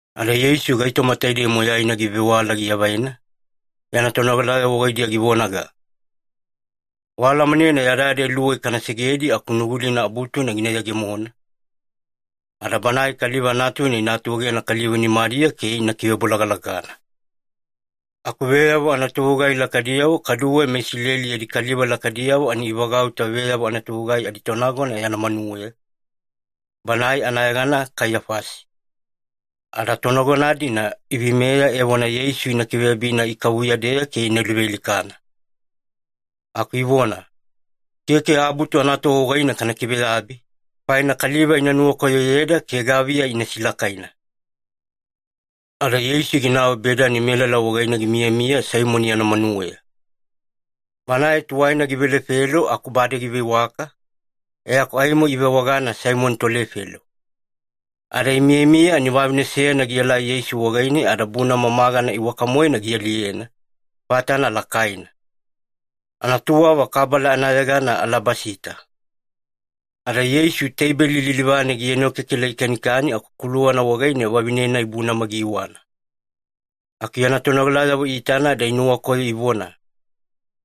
Ada Yeisu gaitoma taidei moyaina givewala giavaina, yana tonogalayavo wagaidiya givonaga, “Waalamanena yadayada iluwei kana segedi aku Nugulina Abutuna gina yegemona, ada Banae Kaliva Natuna ina atuegena kaliva nimadiya ke ina kivebolagalagana.” Aku veyavo anatovegugai lakaidiyavo kaduwe meIsileli yadi kaliva lakaidiyavo ani ivagauta veyavo anatovegugai aditonagona yana manuweya, banae anayegana Kaiyafasi. Ada tonagona-dina iveimeya evona Yeisu ina kiveyabina ikavuya-deya ke ina luvealikana. Aku ivona, “Keke Abutu anatova wagaine kana kiveyabi, faina kaliva ina nuwakoyoyeda ke gaviya ina silakaina.” Ada Yeisu ginau Bedani melala wagaine gimiyamiya Saimoni yana manuweya. Banae tuwaina givelefelo aku bade giveiwaka, e aku aimo ivewagana Saimoni tolefelo. Ada imiyamiya ani vavine seyana gielai Yeisu wagaine ada bunama magana iwaka-moena gialiyena, fatana lakaina. Anatuwava kabala anayegana alabasita. Ada Yeisu teibeli lilivane gienokekela gikanikani aku kuluwana wagaine vavine-nai bunama giiwana. Aku yana tonogalayavo iitana ada inuwakoyo ivona,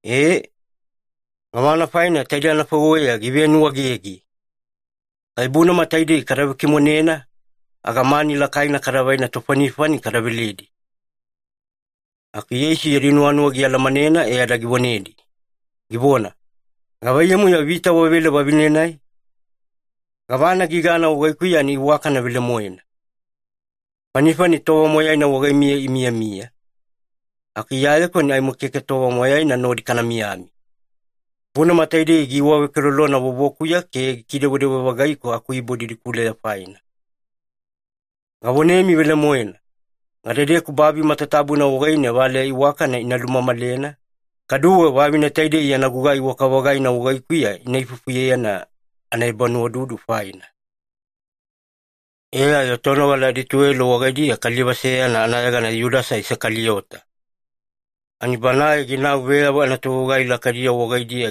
“Ee! Gavana faina taidei anafaiweya givenuwaegege? Kai bunama taidei kada vekimonena aga mani lakaina kadavai tofanifani kada veledi.” Aku Yeisu yadi nuwanuwa gialamanena e ada givonedi, givona, “Gavaiyamu-yo vita wavele vavine-nai? Gavana gigana wagaikuya ani iwakana velemoena. Fanifani tova moyaina wagaimiya imiyamiya, aku Iyayeku ani aimo keke tova moyaina nodi kana miyamiya. Bunama taidei giiwavekelolona vovokuya ke gikidewedewe-vagaiku akuibo didikuleya faina. Gavonemi velemoena, gadedeku babi matatabuna wagaine valeya iwakana ina lumamalena, kaduwe vavine taidei yana gugai iwaka-vagaina wagaikuya ina ifufuyena anaebanuwaududu faina.” E ayo tonogala adituwelo wagaidiya kaliva seyana anayegana Yudasa Isakaliyota. Ani banae ginau veyavo anatovegugai lakaidiyavo wagaidiya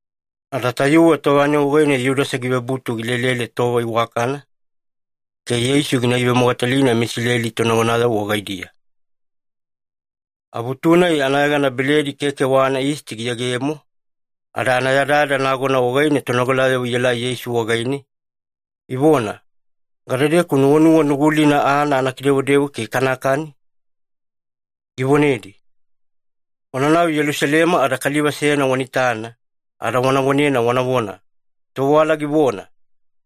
Ada tayuwe tova-nai wagaine Yudasa givebutu gilelele tova iwakana ke Yeisu gina ivemogatalina meIsileli tonagonayavo wagaidiya. Abutu-nai anayegana Beledi Keke wa anaYisti giyegemo, ada anayadayada nagona wagaine tonogalayavo ielai Yeisu wagaine, ivona, “Gadedeku nuwanuwa Nugulina aana ana kidewadewa ke kanakani?” Givonedi, “Wananau Yelusalema ada kaliva seyana wana itana, ada wana vonena wanavona, ‘Tovewala givona,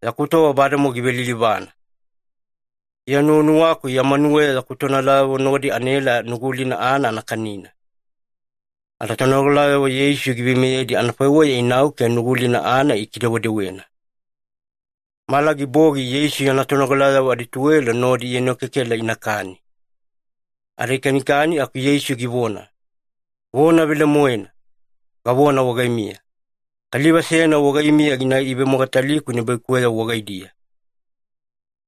Yaku tova bademowa givelilivana. Iya nuwanuwaku ya manuweya yaku tonogalayavo nodi anaela Nugulina aana anakani.’” Ada tonogalayavo Yeisu giveimeyedi anafaiweya inau ke Nugulina aana ikidewedewena. Mala gibogi Yeisu yana tonogalayavo adituwelo nodi ienokekela inakani. Ada ikanikani aku Yeisu givona, “Vona velemoena, gavona wagaimiya, kaliva seyana wagaimiya gina ivemogataliku nibaikuweyavo wagaidiya.”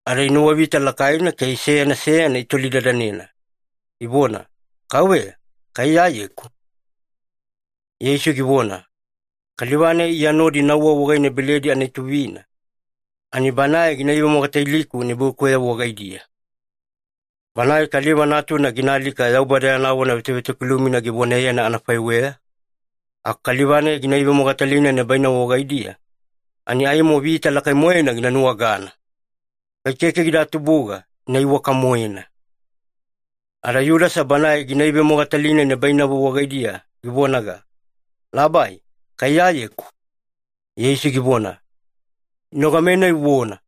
Ada inuwavita lakaina ke seyana seyana itolidadanena, ivona, “Kauveya, kai Iyayeku?” Yeisu givona, “Kaliva-nai Iya nodi nauwa wagaine beledi anaituvina, ani banae gina ivemogataliku nibaikuweyavo wagaidiya. Banae Kaliva Natuna gina alika Yaubada yana vona vetovetokilumina givonayena anafaiweya, aku kaliva-nai gina ivemogatalina nibainavo wagaidiya, ani aimo vita lakai-moena gina nuwagana! Kai keke gida tubuga, ina iwaka-moena.” Ada Yudasa banae gina ivemogatalina nibainavo wagaidiya givonaga, “Labai, kai Iyayeku?” Yeisu givona, “Inogame-nai uvona.”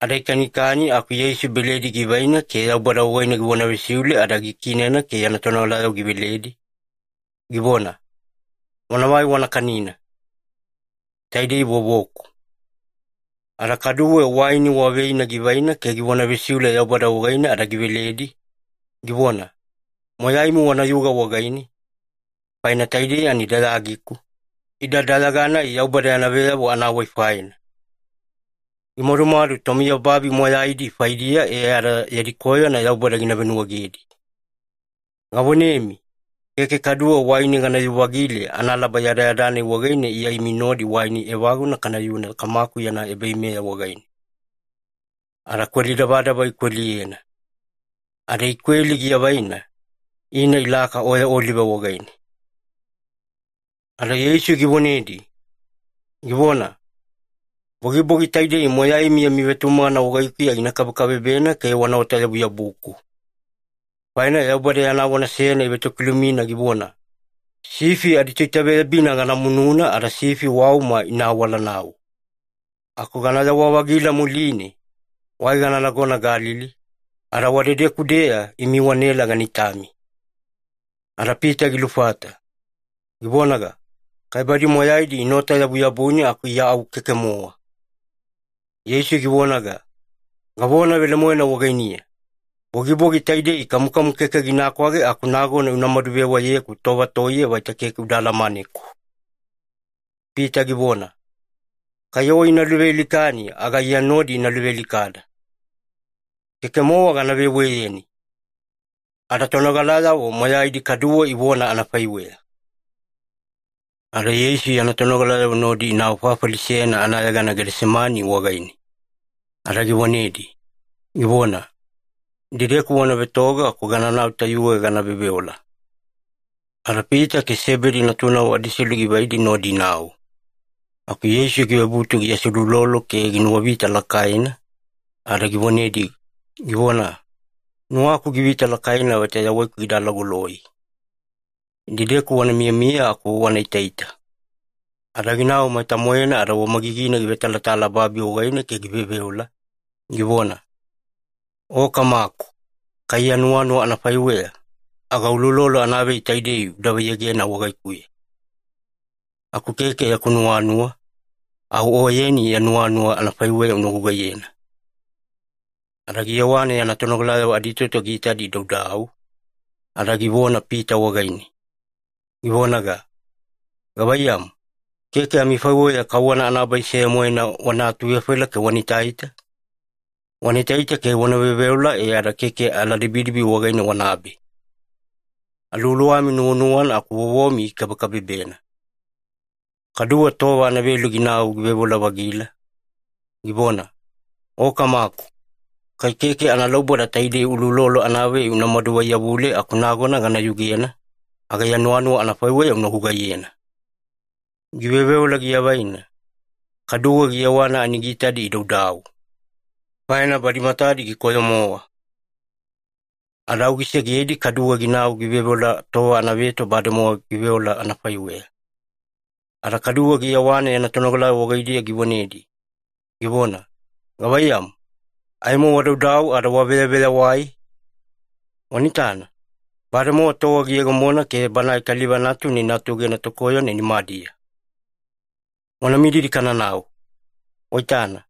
Ada ikanikani aku Yeisu beledi givaina ke Yaubada wagaine givona vesiule ada gikiinena ke yana tonogalayavo giveledi, givona, “Wanavai wana kanina. Taidei vovoku.” Ada kaduwe waini wa veina givaina ke givona vesiule Yaubada wagaine ada giveledi, givona, “Moyaimi wanayuga wagaine, faina taidei ani dayagiku, ida dayaga-nai Yaubada yana veyavo anawai faina. Gimadumadu tomiyababi moyaidi faidiya e ada yadi koyona Yaubada gina venuwaegedi. Gavonemi, keke kaduwe waini ganayu-vagile analaba yadayada-nai wagaine Iya imi nodi waini evaguna kanayuna Kamaku yana ebaveimeya wagaine.” Ada kweli davadava ikweliyena. Ada ikweli giavaina, ina ilaka Oya Olive wagaine. Ada Yeisu givonedi, givona, “Bogibogi taidei moyaimi yami vetumagana wagaikuya gina kabekabebena ke wanaota-yabuyabuku. Faina Yaubada yana vona seyana ivetokilumina givona, ‘Sifi aditoitaveyabina gana mununa ada sifi wauma ina awalanau.’ Aku ganayawa-vagila muline, wai gana nagona Galili, ada wadedeku-deya imi wanaela gana itami.” Ada Pita gilufata, givonaga, “Kai badi moyaidi inaota-yabuyabuni aku Iya au keke-mowa!” Yeisu givonaga, “Gavona velemoena wagainiya, bogibogi taidei kamukamu keke gina kwage aku nagona unamadu veweyeku tova toiye vaita keke uda alamaneku.” Pita givona, “Kai O ina luvealikani aga Iya nodi ina luvealikada. Keke-mowa gana veweyeni!” Ada tonogalayavo moyaidi kaduwe ivona anafaiweya. Ada Yeisu yana tonogalayavo nodi inau fafali seyana anayegana Gedesemani wagaine, ada givonedi, givona, “Idedeku wana vetoga aku gananau tayuwe gana veoveola.” Ada Pita ke Sebedi natunavo adiselu givaidi nodi inau. Aku Yeisu givebutu giaseuloulolo ke ginuwavita lakaina, ada givonedi, givona, “Nuwaku givita lakaina vaita yawaiku gida alagoloi. Idedeku wana miyamiya aku wana itaita.” Ada ginau maita-moena ada wamagigine givetalatala babi wagaine ke giveoveola, givona, “O Kamaku, kai ya nuwanuwa anafaiweya, aga uloulolo anavei taidei uda vaiyegena wagaikuya. Aku keke yaku nuwanuwa, au Oyeni ya nuwanuwa anafaiweya una gugaiyena.” Ada giyewana yana tonogalayavo aditoto giitadi idaudau, ada givona Pita wagaine, givonaga, “Gavaiyamu, keke amifaiweya kauwana anabai seya-moena wana atuvefaila ke wana itaita? Wana itaita ke wana veoveola e ada keke aladibidibi wagaine wanabe. Aluwaluwami nuwanuwana aku vovomi gikabekabebena.” Kaduwe tova anavelu ginau giveoveola-vagila, givona, “O Kamaku, kai keke analauboda taidei uloulolo anavei unamadu vaiyavule aku nagona gana yugena, aga ya nuwanuwa anafaiweya una gugaiyena.” Giveoveola giavaina, kaduwe giyewana ani giitadi idaudau, faina badi matadi gikoyo-mowa. Ada au gisegedi kaduwe ginau giveoveola tova anaveto bademowa giveola anafaiweya. Ada kaduwe giyewana yana tonogalayavo wagaidiya givonedi, givona, “Gavaiyamu, aimo wadaudau ada waveyaveyawai? Wana itana, bademowa tova giyegemona ke Banae Kaliva Natuna ina atuegena tokoyona nimadiya. Wana mididi kananau. Waitana,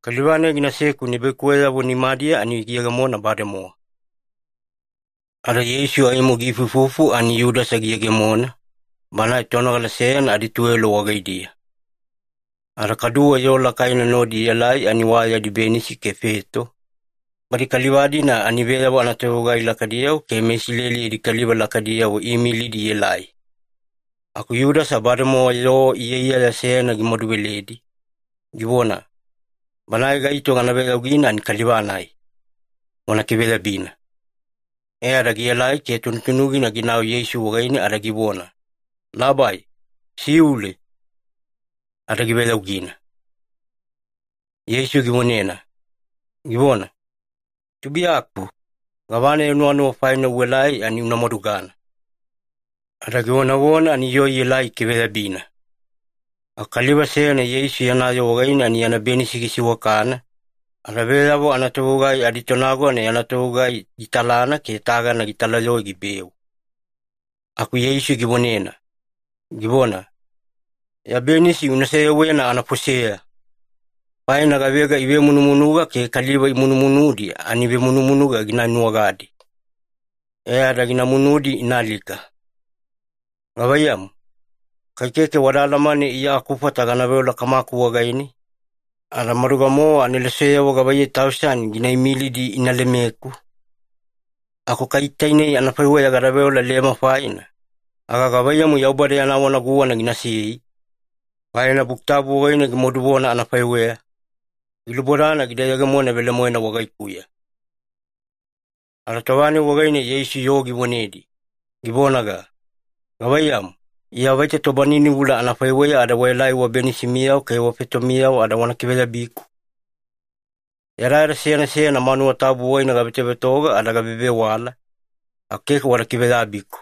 kaliva-nai ginaseku nibaikuweyavo nimadiya ani giyegemona bademowa!” Ada Yeisu aimo giifuifufu ani Yudasa giyegemona, banae tonogala seyana adituwelo wagaidiya. Ada kaduwe yoo lakaina nodi ielai ani wa yadi benisi ke feto, badi kaliva-dina ani veyavo anatovegugai lakaidiyavo ke meIsileli yadi kaliva lakaidiyavo iimilidi ielai. Aku Yudasa bademowa yoo iyaiyaya seyana gimaduveledi, givona, “Banae gaito gana veyaugina ani kaliva-nai. Wana kiveyabina.” E ada gielai ke tunutunugina ginau Yeisu wagaine ada givona, “Labai, siule!” Ada giveyaugina. Yeisu givonena, givona, “Tubuiyaku, gavana ya nuwanuwa faina uelai ani una madugana.” Ada givonavona ani yoo ielai ikiveyabina. Aku kaliva seyana Yeisu yana yoo wagaine ani yana benisi gisiwakana, ada veyavo anatovegugai aditonagona yana togugai gitalana ke tagana gitalayoe gibeu. Aku Yeisu givonena, givona, “Ya benisi una seyewena anafoseya! Faina gavega ivemunumunuga ke kaliva imunumunudi ani vemunumunuga gina nuwagadi, e ada gina munudi ina alika. Gavaiyamu, kai keke wada alamane Iya akufata gana veola Kamaku wagaine, ada maduga-mowa aneloseyavo gavaiyei tausani gina imilidi ina lemeku? Aku kai tainei anafaiweya gada veola lema faina, aga gavaiyamu Yaubada yana vona guwana ginasei? Faina Buki Tabu wagaine gimaduvona anafaiweya, gilubodana gida yegemona velemoena wagaikuya.” Ada tova-nai wagaine Yeisu yoo givonedi, givonaga, “Gavaiyamu, Iya vaita tobaninivula anafaiweya ada waelai wabenisimiyavo ke wafetomiyavo ada wana kiveyabiku? Yadayada seyana seyana manuwa tabu wagaine gavetovetoga ada gavevewala, aku keke wada kiveyabiku.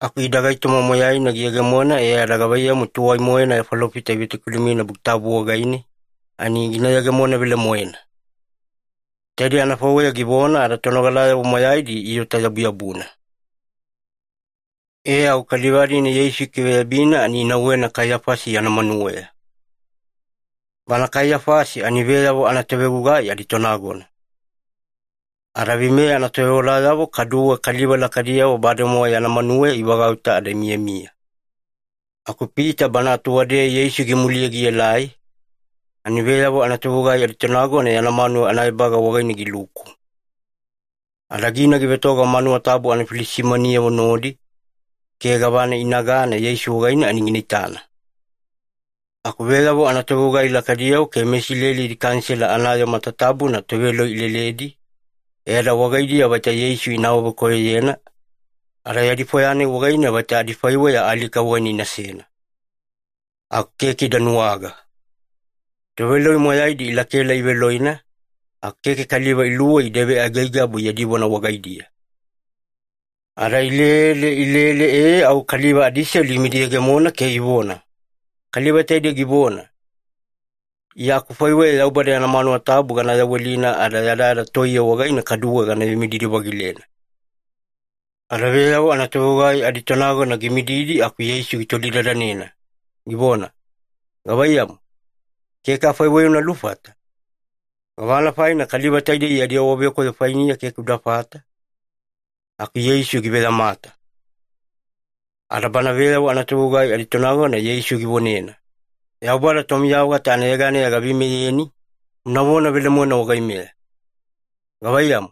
Aku ida gaitoma moyaina giyegemona e ada gavaiyamu tuwai-moena falofitayavo ivetokilumina Buki Tabu wagaine, ani gina yegemona velemoena.” Taidei anafaiweya givona ada tonogalayavo moyaidi iota-yabuyabuna. E au kaliva-dina Yeisu ikiveyabina ani inauwena Kaiyafasi yana manuweya. Bana Kaiyafasi ani veyavo anatovegugai aditonagona. Ada veimeya anatovewalayavo kaduwe kaliva lakaidiyavo bademowa yana manuweya ivagauta ada imiyamiya. Aku Pita bana atuwadeya Yeisu gimuliye gielai, ani veyavo anatovegugai aditonagona yana manuwa anaebaga wagaine giluku. Ada gina givetoga manuwa tabu anafilisimaniyavo nodi, ke gavana inagana Yeisu wagaine ani gina itana. Aku veyavo anatovegugai lakaidiyavo ke meIsileli yadi Kanisela anayoo matatabuna toveloi ileledi, e ada wagaidiya vaita Yeisu ina awavekoyoyena, ada yadi fwaya-nai wagaine vaita adifaiweya alika wagaine inasena. Aku keke ida nuwaga. Toveloi moyaidi ilakaela iveloina, aku keke kaliva iluwei ida veaigaigabu yadi vona wagaidiya. Ada ilele ilele eee au kaliva adiselu imidiyegemona ke ivona, “Kaliva taidei givona, ‘Iya akufaiweya Yaubada yana manuwa tabu gana yawelina ada yadayada toiye wagaine kaduwe gana vemididi-vagilena.’” Ada veyavo anatovegugai aditonagona gimididi aku Yeisu gitolidadanena, givona, “Gavaiyamu, keke afaiweya una lufata? Gavana faina kaliva taidei yadi awavekoyo fainiya keke udafata?” Aku Yeisu giveyamata. Ada bana veyavo anatovegugai aditonagona Yeisu givonena, “Yaubada Tomiya-vagata anayeganeya gaveimeyeni, unavona velemoena wagaimeya. Gavaiyamu,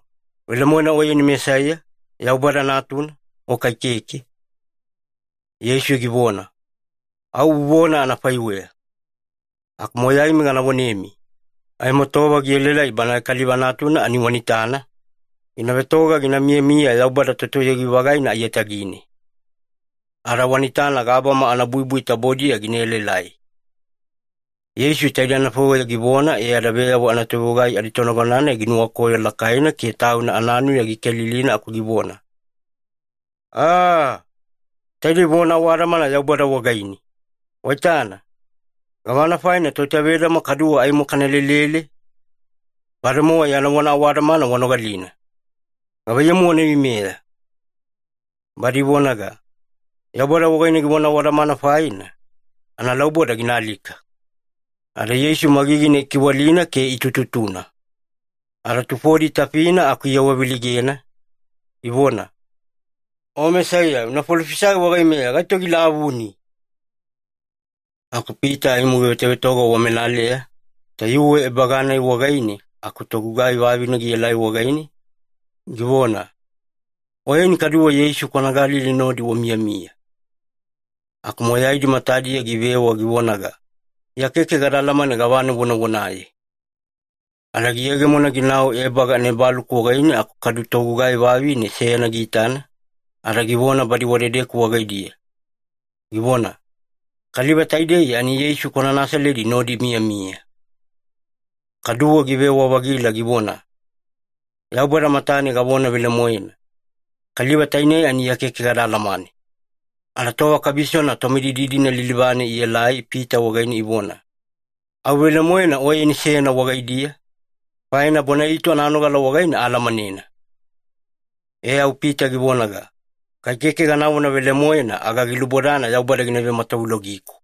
velemoena Oyeni Mesaiya, Yaubada Natuna, o kai keke?” Yeisu givona, “Au uvona anafaiweya. Aku moyaimi gana vonemi, aimo tova gielaelai Banae Kaliva Natuna ani wana itana, gina vetoga gina miyamiya Yaubada Totoyogi-vagaina aiyatagine. Ada wana itana gabama anabuibui tabodiya gina elaelai.” Yeisu taidei anafaiweya givona, e ada veyavo anatovegugai aditonagona-nai ginuwakoyo lakaina ke tauna ananuya gikelilina aku givona, “Aaaa! Taidei vona awadamana Yaubada wagaine! Waitana! Gavana faina toitavedama kaduwe aimo kana lelele? Bademowa yana vona awadamana wanogalina. Gavaiyamu wana veimeya?” Badi ivonaga, “Yaubada wagaine givona awadamana faina, analauboda gina alika!” Ada Yeisu magigina ikiwalina ke itututuna. Ada tufodi itafina aku iawaveleigena, ivona, “O Mesaiya, una falofisai wagaimeya gaito gilavuni!” Aku Pita aimo givetovetoga wamelaleya, tayuwe ebaga-nai wagaine aku togugai vavine gielai wagaine, givona, “Oyeni kaduwe Yeisu kwana Galili nodi wamiyamiya.” Aku moyaidi matadiya givewa givonaga, “Iya keke gada alamane gavana uvonavonaye.” Ada giyegemona ginau ebaga anaebaluku wagaine aku kadu togugai vavine seyana giitana, ada givona badi wadedeku wagaidiya, givona, “Kaliva taidei ani Yeisu kwana Nasaledi nodi imiyamiya.” Kaduwe givewa-vagila givona, “Yaubada matane gavona velemoena, kaliva tainei ani Iya keke gada alamane.” Ada tova kabisona tomididi-dina lilivane ielai Pita wagaine ivona, “Au velemoena oyeni seyana wagaidiya, faina bona-itu ananogala wagaine aalamanena.” E au Pita givonaga, “Kai keke ganavona velemoena aga gilubodana Yaubada gina vematavulogiku.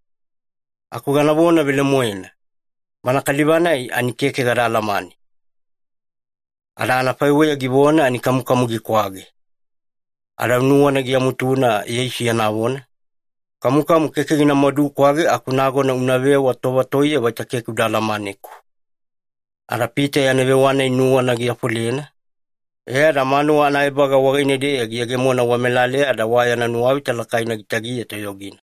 Aku ganavona velemoena, Bana Kaliva-nai ani keke gada alamane.” Ada anafaiweya givona ani kamukamu gikwage. Ada au nuwana giamutuna Yeisu yana vona, “Kamukamu keke gina madukwage aku nagona unavewa tova toiye vaita keke uda alamaneku.” Ada Pita yana vewa-nai nuwana giafolena, e ada manuwa anaebaga wagaine-deya giyegemona wamelaleya ada wa yana nuwavita lakaina gitagiya toyogina.